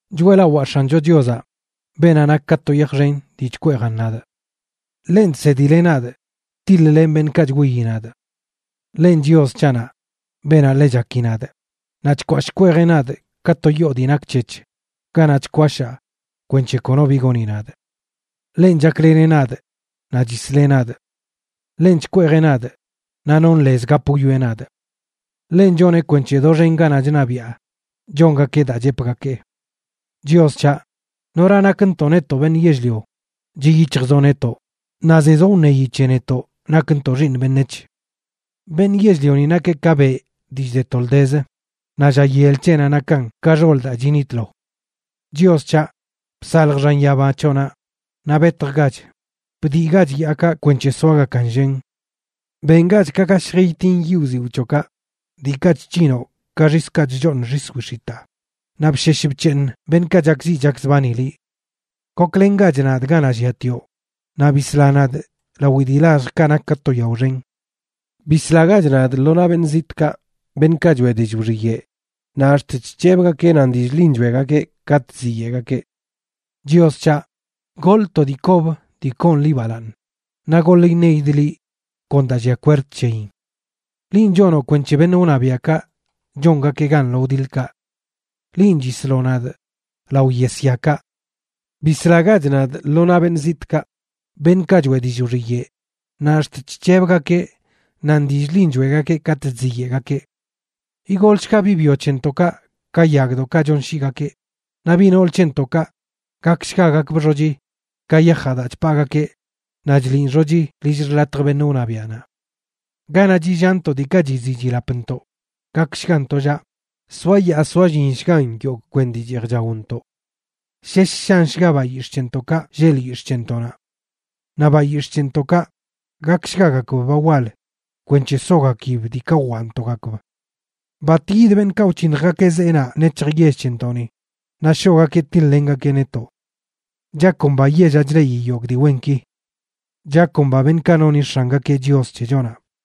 Choeꞌlawaa X̱ancho Chiozaꞌ, beenaꞌ nak ka to yaj xen dii chkweejan nadꞌ. Ḻenꞌ chsedileꞌ nadꞌ tiḻ-lenꞌ beṉꞌkaꞌ chwiyi nadꞌ. Ḻenꞌ Chios c̱haꞌnaꞌ, beenaꞌ ḻe chaki nadꞌ, naꞌ chkwashꞌ chkweejeꞌ nadꞌ ka to yoo dii nak c̱hec̱h ganaꞌ chkwashaa kwenc̱he kono bi goni nadꞌ. Ḻenꞌ chakleneꞌ nadꞌ naꞌ chisleꞌ nadꞌ. Ḻenꞌ chkweejeꞌ nadꞌ, naꞌ nonꞌ lez gap wwieꞌ nadꞌ. Ḻenꞌ choneꞌ kwenc̱he doxen ganaꞌ chṉabiꞌa chongakeꞌ daa chepgakee. Chios c̱haꞌ, ¿nora nakntoꞌ netoꞌ beṉꞌ yell-lio, chiꞌ yic̱hjzoꞌ netoꞌ, naꞌ zezoꞌ wṉeyi c̱he netoꞌ nakntoꞌ xiiṉ beṉec̱h? Beṉꞌ yell-lioni nakeꞌ ka beꞌ dii chde toldezə, naꞌ lla yel c̱heꞌnaꞌ nakan ka xol daa chinitlo. Chios c̱haꞌ, bsalj xan yaba c̱hoꞌnaꞌ naꞌ betjgach; bdiꞌgach yaaꞌka kwenc̱he soagakan llen. Bengach ka gashj itin yiꞌ wziwꞌ c̱hoꞌkaꞌ, diikaꞌ chc̱hinoꞌ ka xiskaꞌ chchooṉ xis wix̱itaa, naꞌ bshesh bc̱heeṉ beṉꞌkaꞌ chakziꞌ chakzbani liꞌ. Goklengach nadꞌ ganaꞌ lliatioꞌ, naꞌ bisla nadꞌ lawi dii lalljkaꞌ nak ka to yao xen. Bislagach nadꞌ lo naꞌ beṉꞌ zitꞌkaꞌ, beṉꞌkaꞌ choeꞌ dillꞌ wxiyeꞌ naꞌ ax̱t chc̱hebgakeꞌ nan dillꞌ ḻin choeꞌgakeꞌ katꞌ chziyeꞌgakeꞌ. Chios c̱haꞌ, goḻꞌ to dii kob dii koon liꞌ balaaṉ, naꞌ goḻ iṉeidꞌ liꞌ kon daa lliaꞌ kwerd c̱heyin. Linꞌ chonoꞌ kwenc̱he beṉꞌ wṉabiaꞌkaꞌ chongakeꞌ gan lo wdiḻkaꞌ. Linꞌ chisloꞌ nadꞌ lao yesyakaꞌ. Bislagach nadꞌ lo naꞌ beṉꞌ zitꞌkaꞌ, beṉꞌkaꞌ choeꞌ dillꞌ wxiyeꞌ, naꞌ ax̱t chc̱hebgakeꞌ nan dillꞌ ḻin choeꞌgakeꞌ katꞌ chziyeꞌgakeꞌ. Igolshga biꞌ byo c̱hentoꞌkaꞌ ka yagdoꞌkaꞌ chonshiigakeꞌ; naꞌ biꞌ nool c̱hentoꞌkaꞌ gakshgagakbꞌ xochi ka yajaꞌ daa chpaagakeꞌ naꞌ chḻiꞌn xochi lill xḻatj beṉꞌ wṉabiaꞌnaꞌ. Ganaꞌ chillaantoꞌ diikaꞌ chiziꞌ chilapntoꞌ gakshgan tollaꞌ; soayaa soallinshgan yogꞌ kwen dii cheej chaontoꞌ. Shesh shanshga bayix̱ꞌ c̱hentoꞌkaꞌ lleꞌ lyix̱ꞌ c̱hentoꞌnaꞌ. Naꞌ bayix̱ꞌ c̱hentoꞌkaꞌ gakshgagakb ba wal kwenc̱he sogakib diikaꞌ wwaꞌntoꞌgakb. Bat yid beṉꞌkaꞌ wc̱hiṉjgakeꞌ zeenaꞌ nec̱hj yell c̱hentoꞌni naꞌ shoꞌgakeꞌ tiḻ-lengakeꞌ netoꞌ. ¡Chakomba yellaꞌ chleꞌi yogꞌ dii wenki! ¡Chakomba beṉꞌkaꞌ noni X̱angakeꞌ Chios c̱hechonaꞌ!